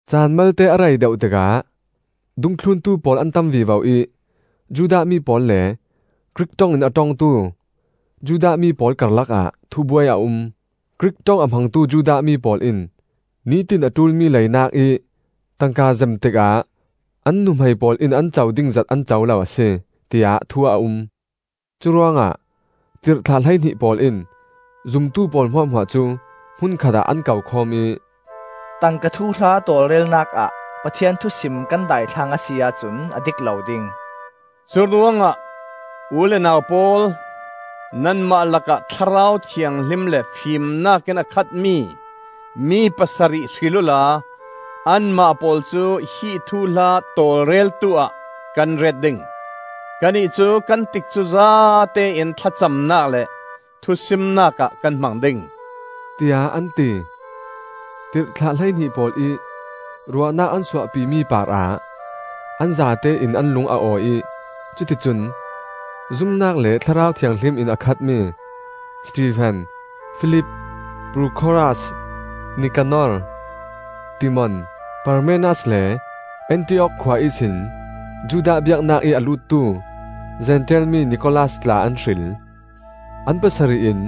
Caan malte a rei deuh tikah dungthluntu pawl an tam vivo ih Judah mi pawl le Grik ṭong in a ṭongtu Judah mi pawl karlak ah thubuai a um. Grik ṭong a hmangtu Judah mi pawl in nitin a ṭulmi leinak ih tangka zem tikah an nuhmei pawl in an co ding zat an co lo a si, tiah thu a um. Curuangah tirhthlah hleihnih pawl in zumtu pawl hmuahhmuah cu hmun khatah an kokhawm ih, “Tangka thuhla tawlrelnak ah Pathian thusim kan daithlang a si ahcun a dik lo ding. Curuangah u le nau pawl, nanmah lakah Thlarau Thianghlim le fimnak in a khatmi mi pasarih hril uhla anmah pawl cu hi thuhla tawlreltu ah kan ret ding. Kannih cu kan tikcu zatein thlacamnak le thusimnak ah kan hmang ding,” tiah an ti. Tirhthlah hleihnih pawl ih ruahnak an suahpi mi parah an zatein an lung a awi ih cuticun zumnak le Thlarau Thianghlim in a khatmi Stefen, Filip, Prokhoras, Nikanor, Timon, Parmenas, le Antiok khua ihsin Judah biaknak ih a luttu Zentail mi Nikolaus tla an hril. An pasarih in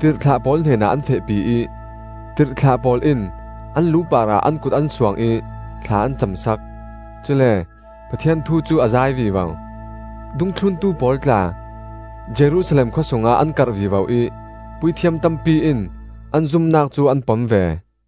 tirhthlah pawl hnenah an fehpi ih tirhthlah pawl in an lu parah an kut an suang ih thla an cam sak. Cule Pathian thu cu a zai vivo. Dungthluntu pawl tla Jerusalem khua sungah an karh vivo ih puithiam tampi in an zumnak cu an pom ve.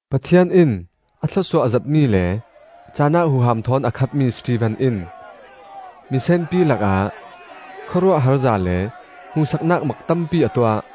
Pathian in a thlawsuah zetmi le cahnak huham thawn a khatmi Stefen in misenpi lakah khawruahharza le hmuhsaknak mak tampi a tuah.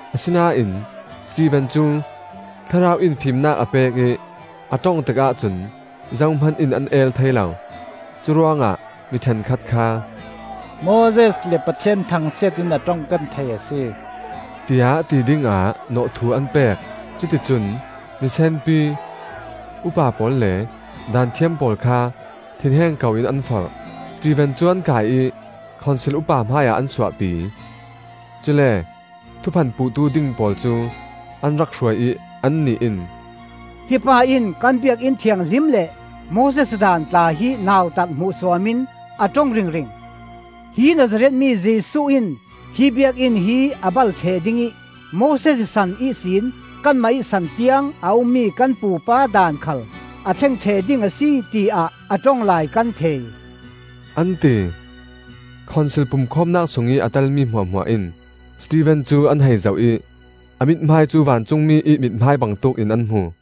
Asinain Stefen cu Thlarau in fimnak a pek ih a ṭong tikah cun zohman in an el thei lo. Curuangah mi ṭhenkhat kha, “Moses le Pathian thangsiat in a ṭong kan thei a si,” tiah ti dingah nawhthuh an pek. Cuti cun misenpi, upa pawl le Daanthiam pawl kha thinheng koin an forh. Stefen cu an kai ih Khonsil upa hmaiah an suahpi. Cule thuphan puhtu ding pawl cu an rak hruai ih annih in, “Hi pa in kan Biakinn Thianghlim le Moses Daan tla hi nautat hmuhsuam in a ṭong ringring. Hi Nazareth mi Jesuh in hi Biakinn hi a bal ṭheh ding ih Moses san ihsin kanmah ih san tiang a ummi kan pupa daan khal a thleng ṭheh ding a si, tiah a ṭong lai kan thei,” an ti. Khonsil pumkhawmnak sungih a telmi hmuahhmuah in Stefen cu an hei zoh ih a mithmai cu vancungmi ih mithmai bangtuk in an hmu.